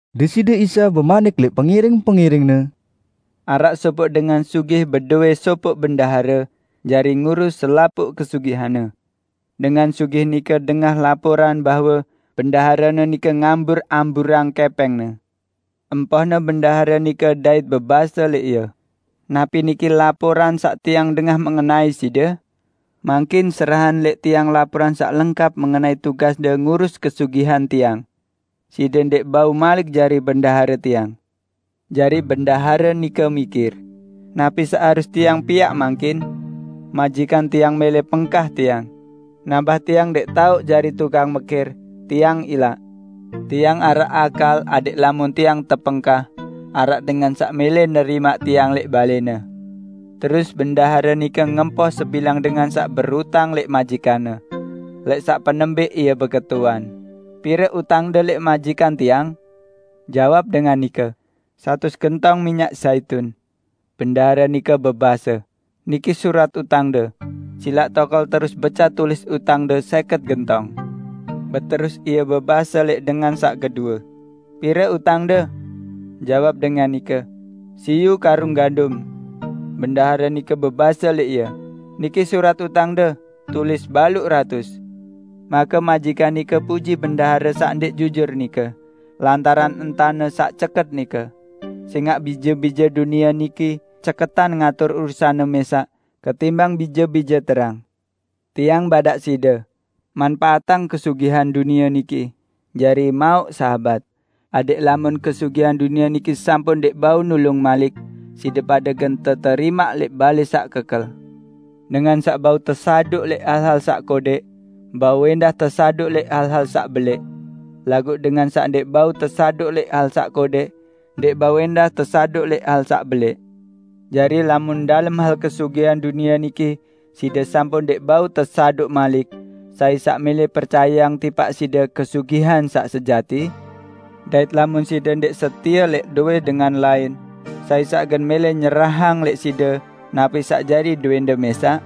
Deside Isa bemanik lẽq pengiring-pengiring-Ne, "Araq sopoq dengan sugih bedowẽ sopoq bendahare jari ngurus selapuq kesugihanne. Dengan sugih nike dengah laporan bahwe bendaharene nike ngambur-amburang kẽpẽngne. Empohne bendahare nike dait bebase lẽq ie, 'Napi niki laporan saq tiang dengah mengenai side? Mangkin, serahang lẽq tiang laporan saq lengkap mengenai tugasde ngurus kesugihan tiang. Side ndẽq bau malik jari bendahare tiang.' Jari bendahare nike mikir, 'Napi saq harus tiang piaq mangkin? Majikan tiang mẽlẽ pengkah tiang. Nambah tiang ndẽq tao, jari tukang mekir, tiang ilaq. Tiang araq akal adẽq lamun tiang tepengkah, araq dengan saq mẽlẽ nerimaq tiang lẽq balẽne!' Terus bendahare nike ngempoh sebilang dengan saq berutang lẽq majikanne. Lẽq saq penembẽq ie beketuan, 'Pire utangde lẽq majikan tiang?' Jawab dengan nike, 'Satus gentong minyak zaitun.' Bendahare nike bebase, 'Niki surat utangde. Silaq tokol terus becat tulis utangde sẽket gentong.' Beterus ie bebase lẽq dengan saq kedue, 'Pire utangde?' Jawab dengan nike, 'Siyu karung gandum.' Bendahare nike bebase lẽq ie, 'Niki surat utangde, tulis baluq ratus.' Make majikan nike puji bendahare saq ndẽq jujur nike, lantaran entane saq ceket nike; sẽngaq bije-bije dunie niki ceketan ngatur urusanne mẽsaq ketimbang bije-bije terang. Tiang badaq side: Manpaatang kesugihan dunie niki jari mauq sahabat, adẽq lamun kesugihan dunie niki sampun ndẽq bau nulung malik, side pade gen teterimaq lẽq balẽ saq kekel. Dengan saq bau tesaduq lẽq hal-hal saq kodẽq, bau ẽndah tesaduq lẽq hal-hal saq belẽq. Laguq dengan saq ndẽq bau tesaduq lẽq hal saq kodẽq, ndẽq bau ẽndah tesaduq lẽq hal saq belẽq. Jari lamun dalem hal kesugihan dunie niki side sampun ndẽq bau tesaduq malik, sai saq mẽlẽ percayeang tipaq side kesugihan saq sejati? Dait lamun side ndẽq setie lẽq dowẽ dengan lain, sai saq gen mẽlẽ nyerahang lẽq side napi saq jari dowẽnde mẽsaq?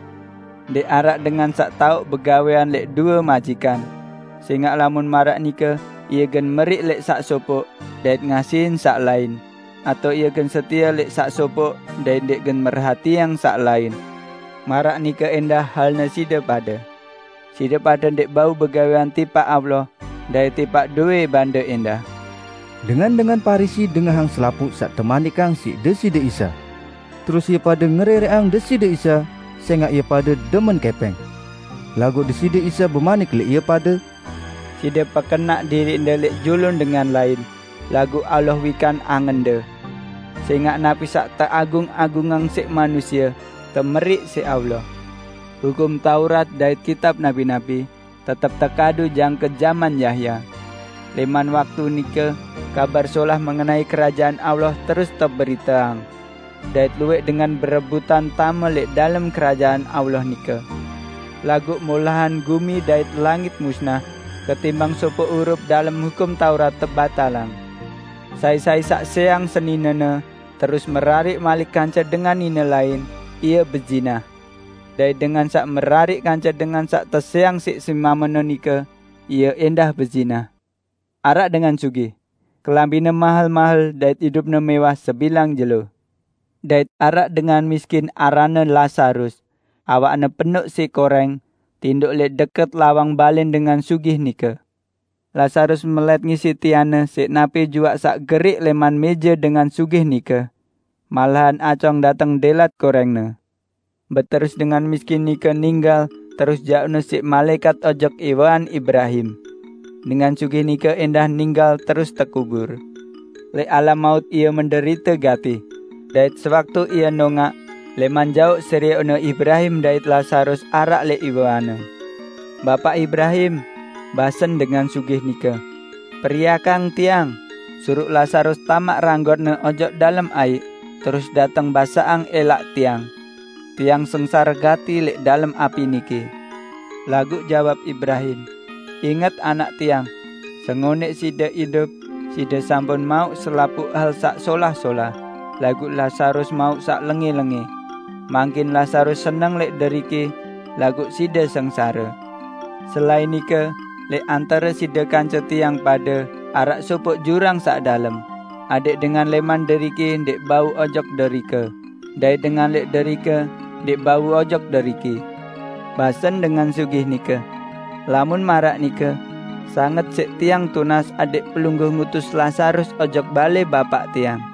Ndẽq araq dengan saq tao begawẽan lẽq due majikan; sẽngaq lamun maraq nike ie gen meriq lẽq saq sopoq dait ngasihin saq lain, atao ie gen setie lẽq saq sopoq dait ndẽq gen merhatiang saq lain. Maraq nike ẽndah halne side pade; side pade ndẽq bau begawẽan tipaq Allah dait tipaq dowẽ bande ẽndah." Dengan-dengan Parisi dengahang selapuq saq temanikang siq Deside Isa. Terus ie pade ngerẽrẽqang Deside Isa, sẽngaq ie pade demen kẽpẽng. Laguq Deside Isa bemanik lẽq ie pade, "Side pekenaq diriqde lẽq julun dengan lain, laguq Allah wikan angende. Sẽngaq napi saq teagung-agungang siq manusie, temeriq siq Allah. Hukum Taurat dait kitab nabi-nabi, tetep tekadu jangke jaman Yahya. Lẽman waktu nike Kabar Solah mengenai Kerajaan Allah terus teberiteang. Dait luwẽq dengan berebutan tame lẽq dalem Kerajaan Allah nike. Laguq molahan gumi dait langit musnah ketimbang sopoq hurup dalem Hukum Taurat tebatalang. Sai-sai saq sẽang seninene, terus merariq malik kance dengan nine lain, ie bezinah. Dait dengan saq merariq kance dengan saq tesẽang siq semamene nike, ie ẽndah bezinah." "Araq dengan sugih. Kelambine mahel-mahel dait idupne mẽwah sebilang jelo. Dait araq dengan miskin aranne Lazarus, awakne penoq siq korẽng, tindoq lẽq dẽkẽt lawang balẽn dengan sugih nike. Lazarus melẽt ngisiq tianne siq napi juaq saq geriq lẽman mẽje dengan sugih nike. Malahan acong dateng dẽlat korẽngne. Beterus dengan miskin nike ninggal terus jauqne siq malaẽkat ojok iwean Ibrahim. Dengan sugih nike ẽndah ninggal terus tekubur. Lẽq alam maut ie menderite gati. Dait sewaktu ie nongaq, lẽman jaoq serioqne Ibrahim dait Lazarus araq lẽq iweanne. 'Bapaq Ibrahim!' basen dengan sugih nike. 'Periakang tiang! Suruq Lazarus tamaq ranggotne ojok dalem aiq terus dateng basaqang ẽlaq tiang. Tiang sengsare gati lẽq dalem api niki!' Laguq jawab Ibrahim, 'Inget anak tiang: Sengonẽq side idup, side sampun mauq selapuq hal saq solah-solah, laguq Lazarus mauq saq lengẽ-lengẽ. Mangkin Lazarus seneng lẽq deriki, laguq side sengsare. Selain nike, lẽq antare side kance tiang pade araq sopoq jurang saq dalem, adẽq dengan lẽq deriki ndẽq bau ojok derike dait dengan lẽman derike ndẽq bau ojok deriki!' Basen dengan sugih nike, 'Lamun maraq nike, sanget siq tiang tunas adẽq Pelungguh ngutus Lazarus ojok balẽ bapaq tiang.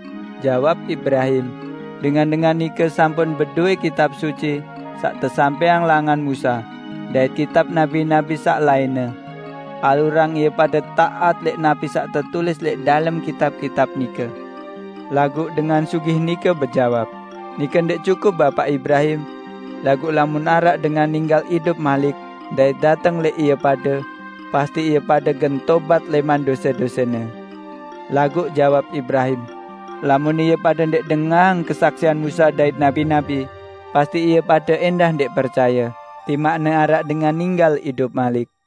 Jawab Ibrahim, 'Dengan-dengan nike sampun bedowẽ Kitab Suci saq tesampẽang langan Musa dait kitab nabi-nabi saq lainne! Alurang ie pade taat lẽq napi saq tetulis lẽq dalem kitab-kitab nike!' Laguq dengan sugih nike bejawab, 'Nike ndẽq cukup, Bapaq Ibrahim. Laguq lamun araq dengan ninggal idup malik dait dateng lẽq ie pade, pasti ie pade gen tobat lẽman dose-dosene.' Laguq jawab Ibrahim, 'Lamun ie pade ndẽq dengahang kesaksian Musa dait nabi-nabi, pasti ie pade ẽndah ndẽq percaye, timaqne araq dengan ninggal idup malik.' "